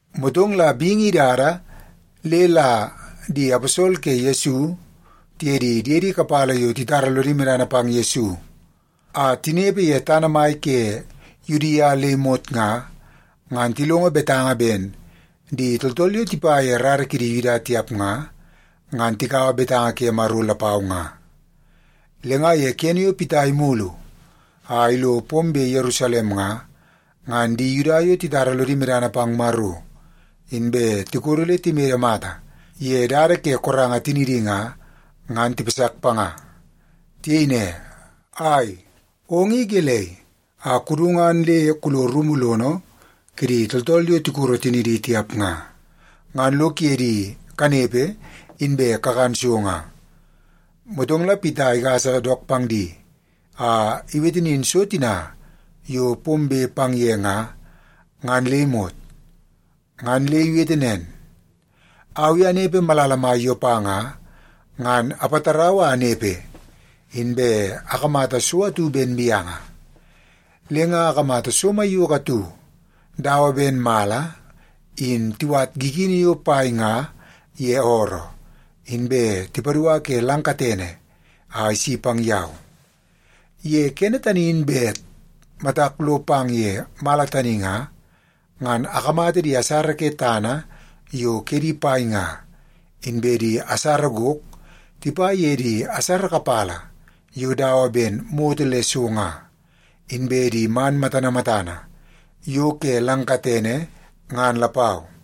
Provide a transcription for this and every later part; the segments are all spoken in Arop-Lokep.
Motong la bingi idada le la di aposol ke Yesu tiye di diedi kapala yo titara lodi medana pang Yesu a tinepe ye tana mai ke Yudia le imot nga, ngan tilongo betanga ben di tooltool yo tipa ye rara kidi Yuda tiap nga, ngan tikaua betanga ke Maro lapau nga. Le nga ye kene yo Pita imulu a ilo pombe Yerusalem nga, ngan di Yuda yo titara lodi medana pang Maro inbe tikodo le timede mata ye dada ke koranga tinidi nga, ngan tipasak panga. Tiyei ne, “Ai, ong i gelei a kudu ngan le kulo rumu lono kidi tooltool yo tikoro tinidi tiap nga, ngan lo kuye di kanepe, inbe kakan so nga?” Motong la Pita igasa dook pang di a iwete nin so tina yo pombe pang ye nga, ngan le imot. Ngan le iwete nen, “Au i anepe malala mai Yopa nga, ngan apatarau a anepe, inbe akamata so atu ben mianga. Le nga akamata so maiyoko atu dawa ben mala in tiwat gigini yo pai nga ye ooroo, inbe tipadua ke lang katene a isi pang yau. Ye kene tani in bet matak lo pang ye mala tani nga, ngan akamata di asara ke tana yo kedi pai nga, inbe di asara gok tipa ye di asara kapala yo dawa ben moto le so nga, inbe di man matana matana yo ke lang katene, ngan lapau.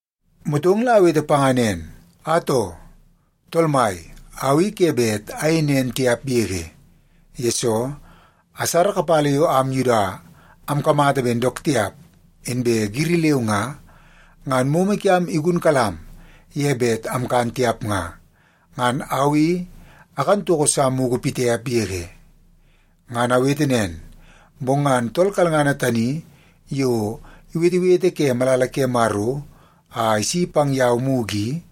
“Motong la awete panga nen, ‘Atoo, Tool Mai! Au i ke bet ayei nen tiap yege, yesoo asara kapala yo am Yuda amkamata ben dook tiap inbe giri leu nga, ngan momo kiam igunkalam ye bet amkan tiap nga, ngan au i akan toko sa mugu pitiap yege.’ “Ngan awete nen, bong ngan tool kalngana tani yo iwetewete ke malala ke Maro a isi pang yau mugu i,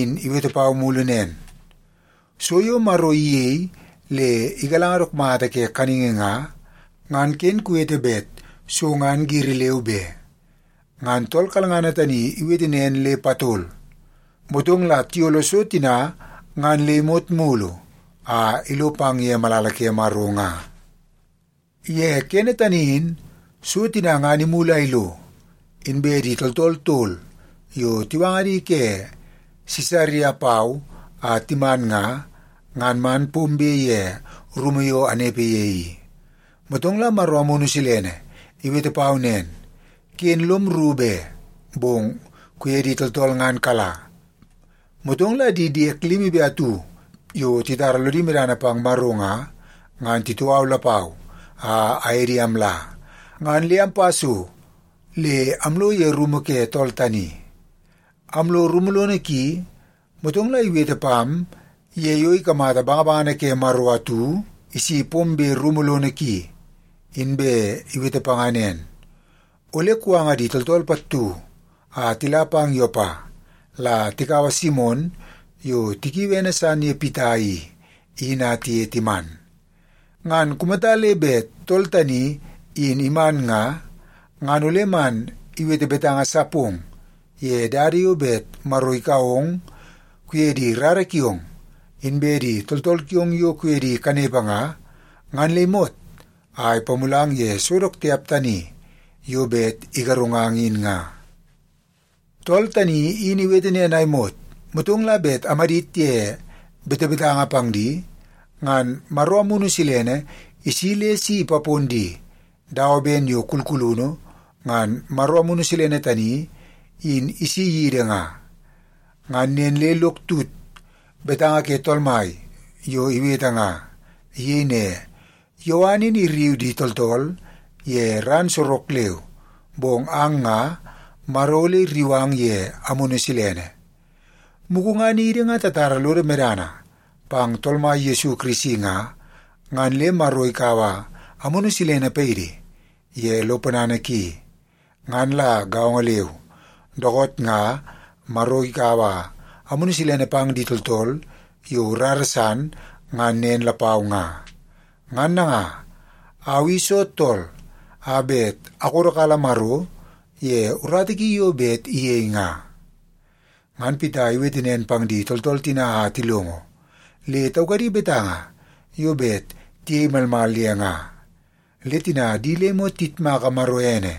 in iwete pau mulu nen, ‘So yo Maro iyei le igalanga dook mata ke kaningi nga, ngan ken kuwete bet so ngan giri leu be.’ Ngan tool kalngana tani in iwete nen le patol, motong la tiyolo so tina ngan le imot mulu a ilo pang ye malala ke Maro nga. “Ye kene tani in so tina ngan imulu a ilo, inbe di tooltool tol yo tiwanga di ke Sisaria pau a timan nga, ngan man pombe ye rumu yo amnepe ye i. Motong la Maro Amunu Silene iwete pau nen, ‘Ken lom rru be, bong kuye di tooltool ngan kala.’ Motong la di diek limi be atu yo titara lodi medana pang Maro nga, ngan titoo au lapau a aye di amla, ngan le ampa so le amlo ye rumu ke tool tani. Amlo rumu lono ki, motong la iwete pam ye yo ikamata bangabangana ke Maro atu isi pombe rumu lono ki, inbe iwete panga nen, ‘Ole kuwanga di tooltool pattu a tila pang Yopa, la tikaua Simon yo tikiui ene san ye Pita i, in a tiye timan. Ngan kumata le bet tool tani in iman nga, ngan ole man iwete betanga sa pong ye dada yo bet Maro ikau ong kuye di rara kiong, inbe di tooltool kiong yo kuye di kanepe nga, ngan le imot a ipamulang ye so dook tiap tani yo bet igarungang in nga.’ “Tool tani in iwete nen a imot, motong la bet amadit ye betebetanga pang di, ngan Maro Amunu Silene isi le si ipapon di, dawa ben yo kulkulunu ngan Maro Amunu Silene tani in isi yidi nga. Ngan nen le lok tut betanga ke Tool Mai yo iwete nga. Iyei ne, ‘Yowan in irriu di tooltool ye ran sorok leu, bong ang nga, Maro ole irriu ang ye Amunu Silene.’ Mugu ngan idi nga tatara lodo medana pang Tool Mai Yesu Kirisi nga, ngan le Maro ikaua Amunu Silene paidi ye lo ponana ki. Ngan la gaongo leu, dookoot nga Maro ikaua Amunu Silene pang di tooltool yo rara san, ngan nen lapau nga. Ngan nanga, au i soo tool a bet akodokala Maro ye urata ki yo bet iyei nga?” Ngan Pita iwete nen pang di tooltool tina a tilongo, le taukadi betanga yo bet tiyei malmal ye nga. Le tina di le imot tiyitmaka Maro ene,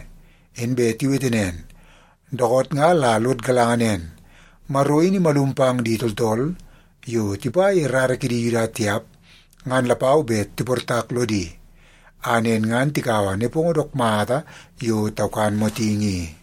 inbe tiwete nen, “Dookoot nga la lod galanga nen, Maro in imalum pang di tooltool yo tipa ye rara kidi Yuda tiap ngan lapau bet tiportak lodi, a nen ngan tikaua nepongo dook mata yo taukan motingi i.”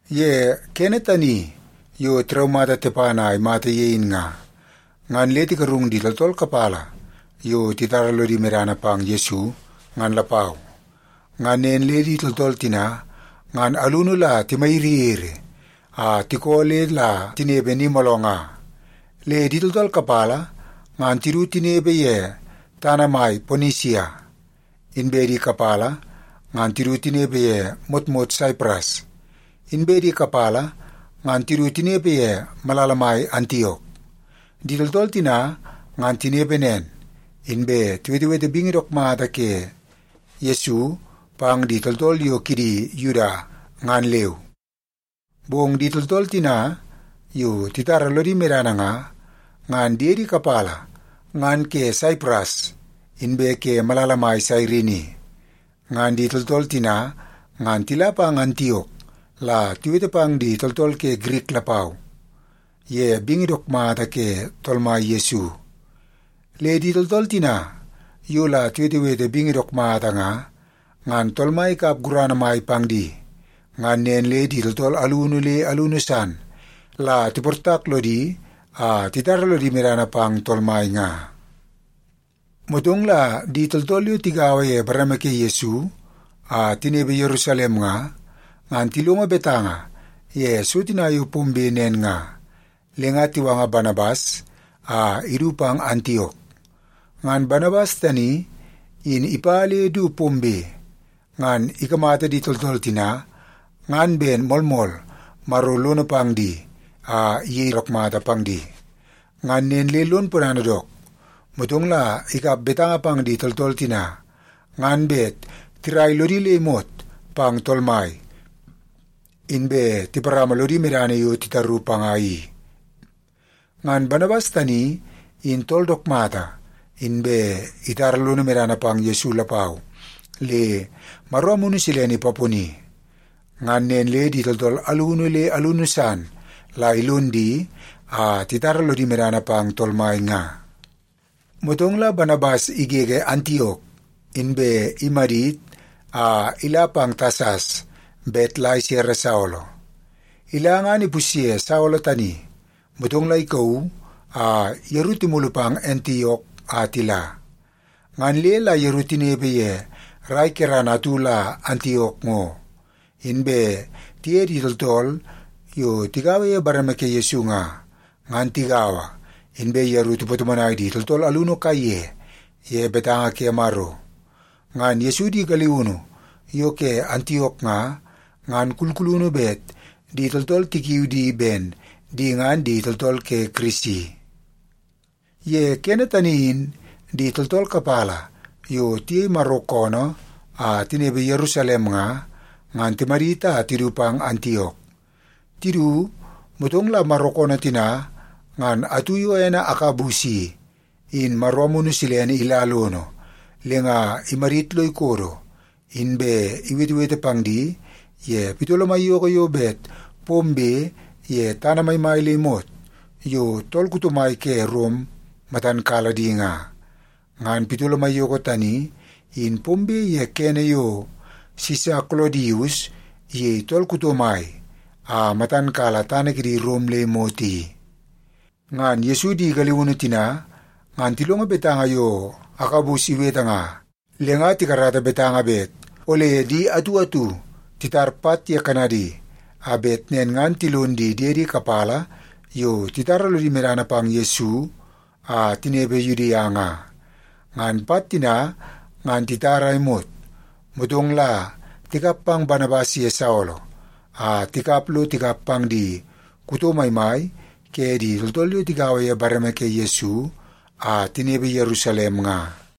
Ye kene tani yo tiraumata Tepan a imata ye in nga, ngan le tigarung di tooltool kapala yo titara lodi medana pang Yesu, ngan lapau. Ngan nen le di tooltool tina ngan alunu la timayiriyiri a tikoo le la tinepe ni mooloo nga. Le di tooltool kapala ngan tidu tinepe ye tana mai Ponisia, inbe di kapala ngan tidu tinepe ye motmot Saipras, inbe di kapala ngan tidu tinepe ye malala mai Antiok. Di tooltool tina ngan tinepe nen, inbe tiwetewete bingi dook mata ke Yesu pang di tooltool yo kidi Yuda, ngan leu. Bong di tooltool tina yo titara lodi medana nga, ngan diedi kapala ngan ke Saipras inbe ke malala mai Sairini. Ngan di tooltool tina ngan tila pang Antiok la tiwete pang di tooltool ke Girik lapau ye bingi dook mata ke Tool Mai Yesu. Le di tooltool tina yo la tiwetewete bingi dook mata nga, ngan Tool Mai ikap gurana mai pang di, ngan nen le di tooltool alunu le alunu san la tiportak lodi a titara lodi medana pang Tool Mai nga. Motong la di tooltool yo tigaua ye bareme ke Yesu a tinepe Yerusalem nga, ngan tilongo betanga ye so tina yo pombe nen nga, le nga tiwanga Banabas a idu pang Antiok. Ngan Banabas tani in ipa le du pombe, ngan ikamata di tooltool tina ngan ben moolmool Maro lono pang di a iyei dook mata pang di. Ngan nen le lon ponana dook. Motong la ikap betanga pang di tooltool tina ngan bet tirai lodi le imot pang Tool Mai, inbe tiparama lodi medana yo titaru panga i. Ngan Banabas tani in tool dook mata, inbe itara lono medana pang Yesu lapau, le Maro Amunu Silene ipaponi. Ngan nen le di tooltool alunu le alunu san la ilon di a titara lodi medana pang Tool Mai nga. Motong la Banabas igege Antiok, inbe imadit a ila pang Tasas bet la isere Saolo. Ila ngan ipusye Saolo tani, motong la ikauu a yeru timulu pang Antiok a tila. Ngan le la yeru tinepe ye rai kerana atu la Antiok ngo, inbe tiye di tooltool yo tigaua ye bareme ke Yesu nga, ngan tigaua, inbe yeru tipatomonai di tooltool alunu kaiye ye betanga ke Maro. Ngan Yesu di galiunu yo ke Antiok nga, ngan kulkulunu bet di tooltool tikiu di ben di ngan di tooltool ke Kirisi. Ye kene tani in di tooltool kapala yo tiyei Maro koonoo a tinepe Yerusalem nga, ngan timadit a tidu pang Antiok. Tidu, motong la Maro koonoo tina ngan atu yo ene Agabus i, in Maro Amunu Silene ila lono le nga imadit lo ikodo, inbe iwetewete pang di ye pitolo maiyoko yo bet pombe ye tana maimai le imot yo tool kuto mai ke Rom matan kala di nga. (Ngan pitolo maiyoko tani in pombe ye kene yo Sisa Kolodius iyei tool kuto mai a matan kala tana kidi Rom le imot i.) Ngan Yesu di galiunu tina ngan tilongo betanga yo Agabus iwete nga, le nga tikarata betanga bet ole di atu atu titar pat ye kanadi, a bet nen ngan tilon di diedi kapala yo titara lodi medana pang Yesu a tinepe Yudia nga. Ngan pat tina ngan titar a imot, motong la tikap pang Banabas ye Saolo a tikap lo tikap pang di kuto maimai ke di tooltool yo tigaua ye bareme ke Yesu a tinepe Yerusalem nga.